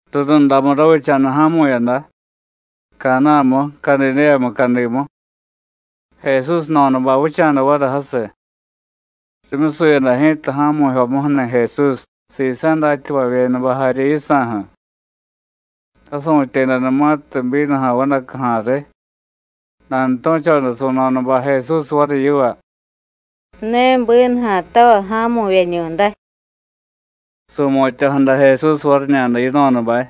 Rurundamu ravicha̱da ja̱mu̱yada, Caná̱mu, Cadidéya mucadimu. Jesús jno̱dabay vicha̱da variy jasiy. Rimyusuyada ji̱ta ja̱mu̱jyomuju̱ni̱ Jesús, sisa̱ datyavavyedabay jarye yisa̱ju̱. Rasu̱tyedanumatiy bínuja̱ vadacuja̱ riy, nanutu̱choda su̱no̱dabay Jesús variy yiva: “Ne bínuja̱tavay ja̱mu̱vyeñu̱day.” Su̱mutya̱jada Jesús variñada yino̱dabay: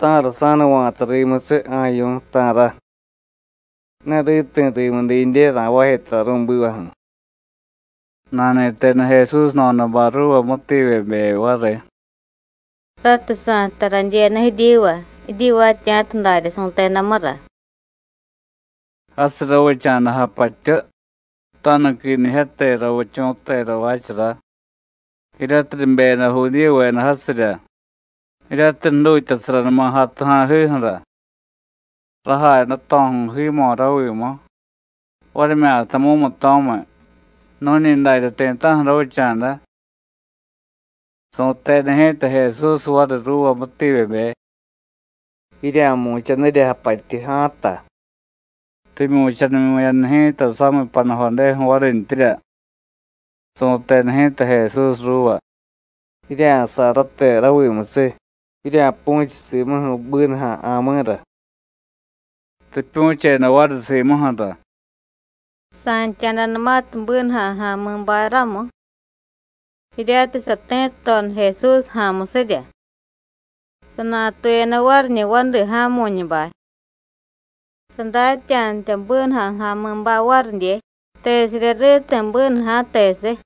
“¿Ta̱ra sa̱nuva̱ta rimusiy, ja̱yu̱, ta̱ra? Ne riti̱ rimu didye ra̱jvaaje tara ru̱bivaju̱.” Nani̱teda Jesús jno̱dabay ruuva mútiivyebe variy: “Ratiy sa̱jtay radyenu jiryiva, jiryivaatya̱ta daryá su̱tedamura.” Jasiy ravicha̱da japatyu, tanuquinijyate ravichu̱tera jvaachara, jiryatiy ribeyada Judíyuveda jasirya, jiryatiy jdutyasaranuma jatuja̱jiju̱ra. Rajay dato̱ju̱y jiimo̱ ravimu, varimyata mumuto̱miy, nu̱ñi darya ti̱ta̱ju̱ ravicha̱da. Su̱teda ji̱ta Jesús variy ruuva mútiivyebe: “Jirya̱mu̱chanirya japatyu ja̱a̱ta.” Rimyu̱chanimyu̱yada ji̱ta samiy panujodeju̱ varintyirya. Su̱teda ji̱ta Jesús ruuva: “Jirya̱say rate ravimusiy, jirya̱pu̱chiy simuju̱ bínuja̱ ja̱mi̱ra.” Ripyu̱cheda variy simuju̱ra. Sa̱ntya̱danumatiy bínuja̱ ja̱mi̱bay ramu, jiryatiy sati̱tudoda Jesús ja̱a̱musirya, sanatuyada variñi̱ vadi ja̱mu̱ñubay. (Sadatya̱datya bínuja̱ ja̱mi̱bay varidye tesirya riti̱ bínuja̱, tesiy.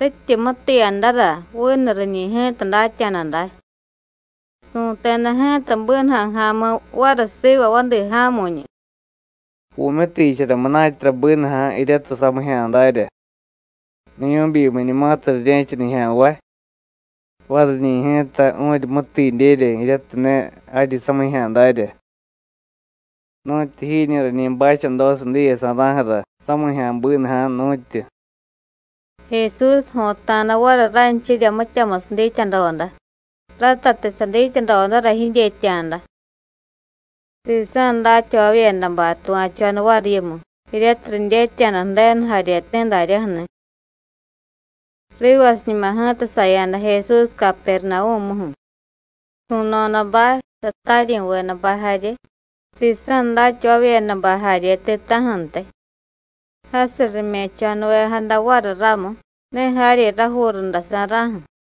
Rityi mutiiyadara, vinu riñi̱ ji̱ta datya̱da day.) Su̱teda ji̱ta bínuja̱ ja̱mi̱ variy siva vadi ja̱mu̱ñu: “Vu̱myutiichara munatyara bínuja̱ jiryatiy samijya̱ darya, niyu̱byimiñumatiy rirye̱cha nijya̱nvay, variñi̱ ji̱ta vu̱ryi mútiidyerya jiryatiy ne jaryi samijya̱ darya. ¡Nu̱tyu jiñi̱ rañi bachadosiy diyesa̱ra̱ju̱ra samijya̱ bínuja̱, nu̱tyu!” Jesús jo̱ta̱da variy ranchirya mityamusiy dityadoda, ratatiy sadityadodara jidyetya̱da. Sisa̱ datyavavyedabay tuva̱choda variy yimu, jiryatiy ridyetya̱da Ju̱denu jaryeti̱ daryaju̱ni̱. Rivasiñuma ji̱ta saya̱da Jesús Capernavú̱muju̱, su̱no̱dabay, sataryi̱vedabay jarye, sisa̱ datyavavyedabay jarye ti̱ta̱ju̱ntiy. Jasiy rime̱cho̱nuvejada variy ramu, ne jaryi rajuu rundasa̱ra̱ju̱.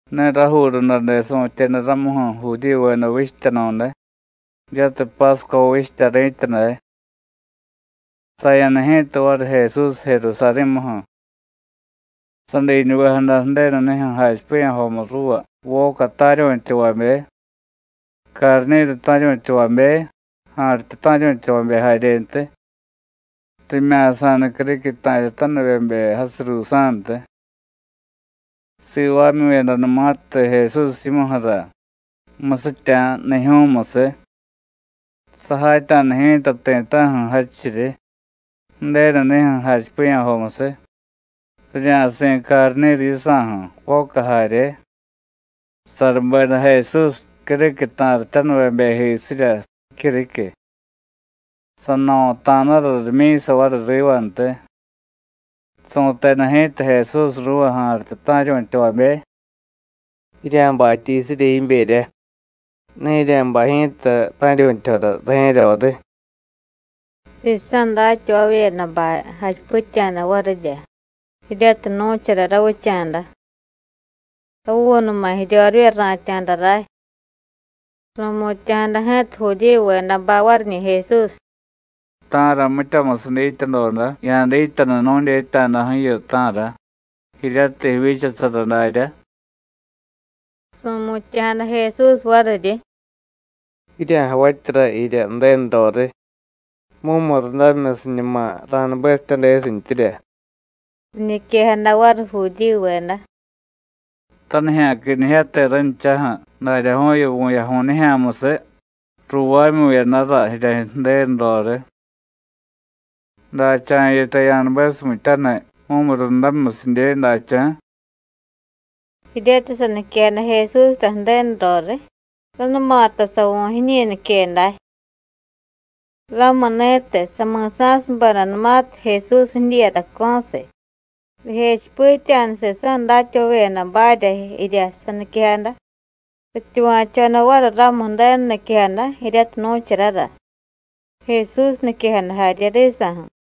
Ne rajuu rundade su̱tyeda ramuju̱, Judíyuveda vichtyanu̱day, jiryatiy Pásco vichtya ri̱tya day. Saya̱da ji̱ta variy Jesús Jerusarí̱muju̱. Sadiñuvejada Ju̱denu nijyu̱ jachipiya̱jomu ruuva voca ta̱ryu̱tyavabe, carni̱ru ta̱ryu̱tyavabe, ja̱rityu ta̱ryu̱tyavabe jaryentiy, rimya̱sa̱da criquiy ta̱ryatanivyebe jasiy ruusa̱ntiy. Sivaamyu̱yadanumatiy Jesús yimuju̱ra musitya̱ jnijyu̱musiy, sajatya̱da ji̱ta ti̱ta̱ju̱ jadchiryi, Ju̱denu nijyu̱ jachipiya̱jomusiy, rirya̱si̱ carni̱ru yisa̱ju̱, voca jarye. Sarubeda Jesús criquiy ta̱ryatanivyebejisirya jicyuriquiy. Sano̱ta̱dara rimyi̱sa rivantiy. Su̱teda ji̱ta Jesús ruuva ja̱rityu ta̱ryu̱tyavabe: “Jirya̱batya jiyusirya jiberya. Ne jirya̱bay ji̱ta ta̱ryu̱tyajora rajye̱ roriy.” Sisa̱ datyavavyedabay jachipitya̱da varirya jiryatiy nu̱chara ravicha̱da: “Ravuunuma̱ jiryorivya ra̱tya̱da ray.” Ru̱mutya̱jada ji̱ta Judíyuvedabay variñi̱ Jesús: “¿Ta̱ra mityamusiy dityadoda ya̱dityanu nu̱dyetya̱daju̱yu, ta̱ra, jiryatiy jivyichasara daryá?” Su̱mutya̱jada Jesús variryi: “Jirya̱javatyara jirya Ju̱denu roriy, mumurundamimyusiñuma ra̱nubesityadesintyirya.” Riñiquejada variy Judíyuveda: “Tanijya̱quinijyate ranchaju̱, daryaju̱yu vu̱yaju̱y nijya̱musiy ruuvaamyu̱yadara jirya Ju̱denu roriy. ¿Dacha̱ yitay ya̱nubesumityaniy mumurundamimyusidye, dacha̱?” Jiryatiy saniquejada Jesúsra Ju̱denu roriy, ránumata savu̱ jiñi nique day. Ramuni̱tiy, sami̱sa̱subedanumatiy Jesús jidyiiyadaco̱siy, rijechipitya̱da sisa̱ datyavavyedabarya jirya saniquejada, rityuva̱choda variy ramu Ju̱denu niquejada jiryatiy nu̱charara, Jesús niquejada jarye risa̱ju̱.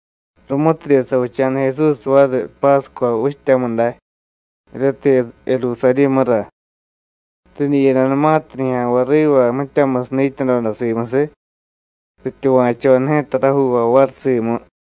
Rumutidye savicha̱da Jesús variy Pásco vichtyamu day jiryatiy Jerusarí̱mura, ridyiyadanumatiy nijya̱nvay riva mityamusiy dityadoda simusiy, rityuva̱choda ji̱ta rajuuvay variy simu.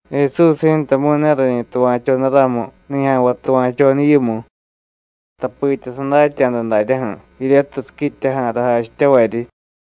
Jesús ji̱tamu̱y ne rañi tuva̱choda ramu nijya̱nvay tuva̱choda yimu, tapitya sadatya̱da daryaju̱ jiryatiy siquityaja̱ra jachityavaryi.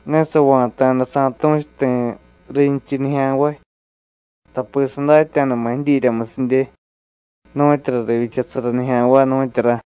Ne sava̱ta̱da sa̱tu̱chu ti̱ rinchiy nijya̱nvay, tapi sadatya̱dama̱ jidyiryamusidye nu̱tyura rivyichasara nijya̱nvay, nu̱tyura.